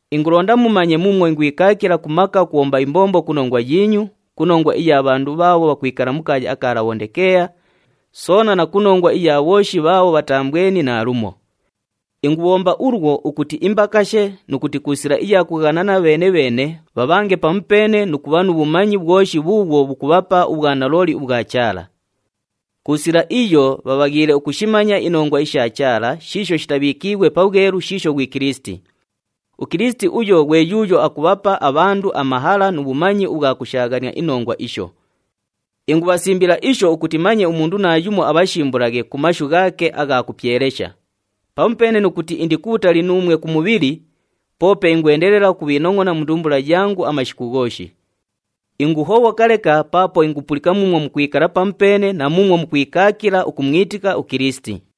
Ingulonda mumanye muumwo ingwikaakila ku maka ukubhomba imbombo ku nongwa yiinyu, ku nongwa iya bhandu bhaabho bhakwikala mu kaaya aka Labhondikeeya, soona na ku nongwa iya bhooshi bhaabho bhataambweni naalumo. Ingubhomba ulwo ukuti imbakashe nu kuti ku sila iya kughanana bheene-bheene bhabhange pamupeene nu kubha nu bhumanyi bhwoshi bhuubhwo bhukubhapa ubhwanalooli ubhwa Chaala. Ku sila iyo bhabhaghiile ukushimanya inongwa isha Chaala shiisho shitabhiikiighwe pabhwelu shiisho ghwi Kilisiti. UKilisiti uyo ghwe yuuyo akubhapa abhandu amahala nu bhumanyi ubhwa kushaaghania inongwa isho. Ingubhasimbila isho ukuti manye umundu naayumo abhashimbulaghe ku mashu ghaake agha kupyelesha. Pamupeene nu kuti indi kubhutali nuumwe ku mubhili, poope ingwendelela ukubhiinongʼona mu ndumbula yangu amashiku ghooshi. Inguhobhoka leka paapo ingupulika muumwo mukwikala pamupeene na muumwo mukwikaakila ukumwitika uKilisiti.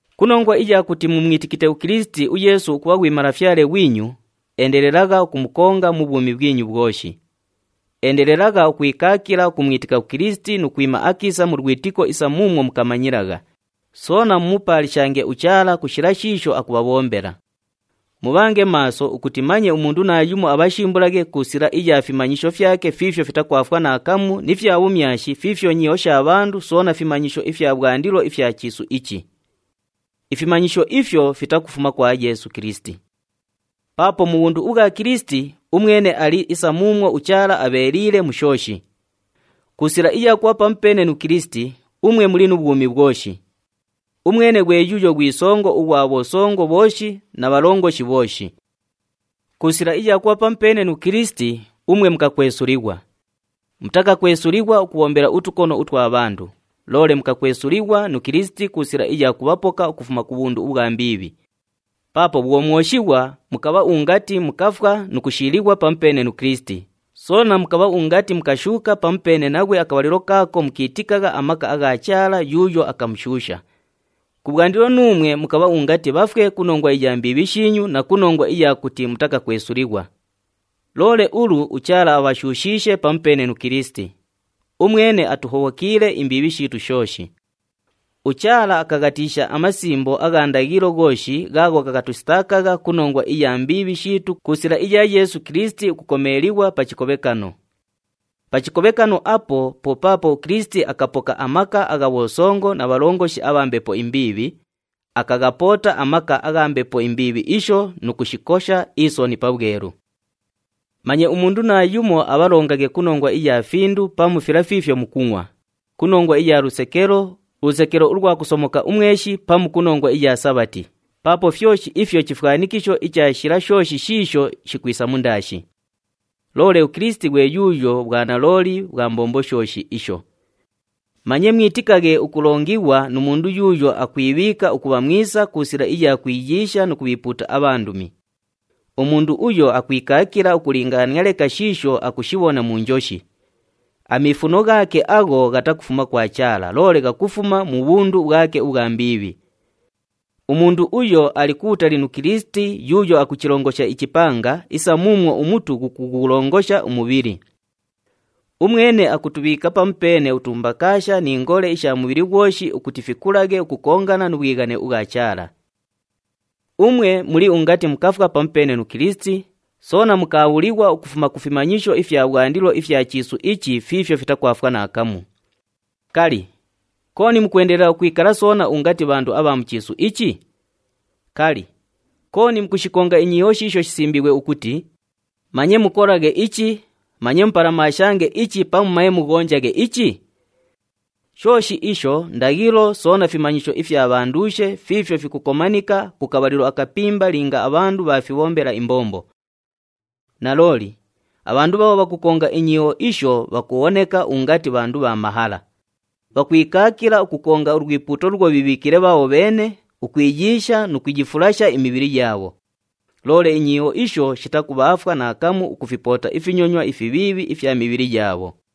Ku nongwa iya kuti mumwitikite uKilisiti uYeesu ukubha ghwi Malafyale ghwinyu, endelelagha ukumukonga mu bhwumi bhwinyu bhwoshi. Endelelagha ukwikaakila ukumwitika uKilisiti nu kwima akiisa mu lwitiko isa muumwo mukamanyilagha. Soona mumupaalishange uChaala ku shila shiisho akubhabhombela. Mubhange maaso ukuti manye umundu naayumo abhashimbulaghe ku sila iya fimanyisho fyake fiifyo fitakwafwa naakamu ni fya bhumyashi fiifyo nyiiho sha bhandu soona fimanyisho ifya bhwandilo ifya chiisu ichi. Ifimanyisho ifyo fitakufuma kwa Yeesu Kilisiti. Paapo mu bhundu ubhwa Kilisiti, umwene ali isa muumwo uChaala abheeliile mu shooshi. Ku sila iya kubha pamupeene nu Kilisiti, umwe muli nu bhwumi bhwoshi. Umwene ghwe yuuyo ghwi songo ughwa bhosongo bhooshi na bhalongoshi bhooshi. Ku sila iya kubha pamupeene nu Kilisiti, umwe mukakwesulighwa. Mutakakwesulighwa ukubhombela utukono utwa bhandu, loole mukakwesulighwa nu Kilisiti ku sila iya kubhapoka ukufuma ku bhundu ubhwa mbiibhi. Paapo bhwo mwoshighwa, mukabha ungati mukafwa nu kushiilighwa pamupeene nu Kilisiti, soona mukabha ungati mukashuuka pamupeene naghwe akabhalilo kaako mukiitikagha amaka agha Chaala yuuyo akamushuusha. Kubhwandilo nuumwe mukabha ungati bhafwe ku nongwa iya mbiibhi shiinyu na ku nongwa iya kuti mutakakwesulighwa. Loole ulu uChaala abhashuushiishe pamupeene nu Kilisiti. Umwene atuhobhokiile imbiibhi shiitu shooshi. UChaala akaghatiisha amasimbo agha ndaghilo ghooshi ghaagho ghakatusitaakagha ku nongwa iya mbiibhi shiitu ku sila iya Yeesu Kilisiti ukukomeelighwa pa chikobhekano. Pa chikobhekano apo, po paapo uKilisiti akapoka amaka agha bhosongo na bhalongoshi abha mbepo imbiibhi, akaghapoota amaka agha mbepo imbiibhi isho nu kushikosha isoni pabhwelu. Manye umundu naayumo abhalongaghe ku nongwa iya findu pamu fila fiifyo mukungʼwa, ku nongwa iya lusekelo, ulusekelo ulwa kusomoka umweshi pamu ku nongwa iya Sabhati, paapo fyoshi ifyo chifwanikisho icha shila shooshi shiisho shikwisa mundaashi. Loole uKilisiti ghwe yuuyo bhwanalooli bhwa mbombo shooshi isho. Manye mwitikaghe ukulongighwa nu mundu yuuyo akwibhiika ukubha mwisa ku sila iya kwiyiisha nu kubhiipuuta abhandumi. Umundu uyo akwikaakila ukulingaania leka shiisho akushibhona mu njoshi. Amiifuno ghaake agho ghatakufuma kwa Chaala, loole ghakufuma mu bhundu bhwake ubhwa mbiibhi. Umundu uyo ali kubhutali nu Kilisiti yuuyo akuchilongosha ichipanga isa muumwo umutu ghukughulongosha umubhili. Umwene akutubhiika pamupeene utumbakaasha ni ngole isha mubhili ghwoshi ukuti fikulaghe ukukongana nu bhwighane ubhwa Chaala. Umwe muli ungati mukafwa pamupeene nu Kilisiti, soona mukaabhulighwa ukufuma ku fimanyisho ifya bhwandilo ifya chiisu ichi fiifyo fitakwafwa naakamu. Kali, kooni mukwendelela ukwikala soona ungati bhandu abha mu chiisu ichi? Kali, kooni mukushikonga inyiiho shiisho shisimbiighwe ukuti, “Manye mukolaghe ichi, manye mupalamaashange ichi pamu manye mughonjaghe ichi”? Shooshi isho ndaghilo soona fimanyisho ifya bhanduushe fiifyo fikukomanika ku kabhalilo akapimba linga abhandu bhaafibhombela imbombo. Nalooli, abhandu bhaabho bhakukonga inyiiho isho bhakubhoneka ungati bhandu bha mahala. Bhakwikaakila ukukonga ulwipuuto luulwo bhiibhiikiile bhaabho bheene, ukwiyiisha nu kuyifulasha imibhili yaabho. Loole inyiiho isho shitakubhaafwa naakamu ukufipoota ifinyonywa ifibhiibhi ifya mibhili yaabho.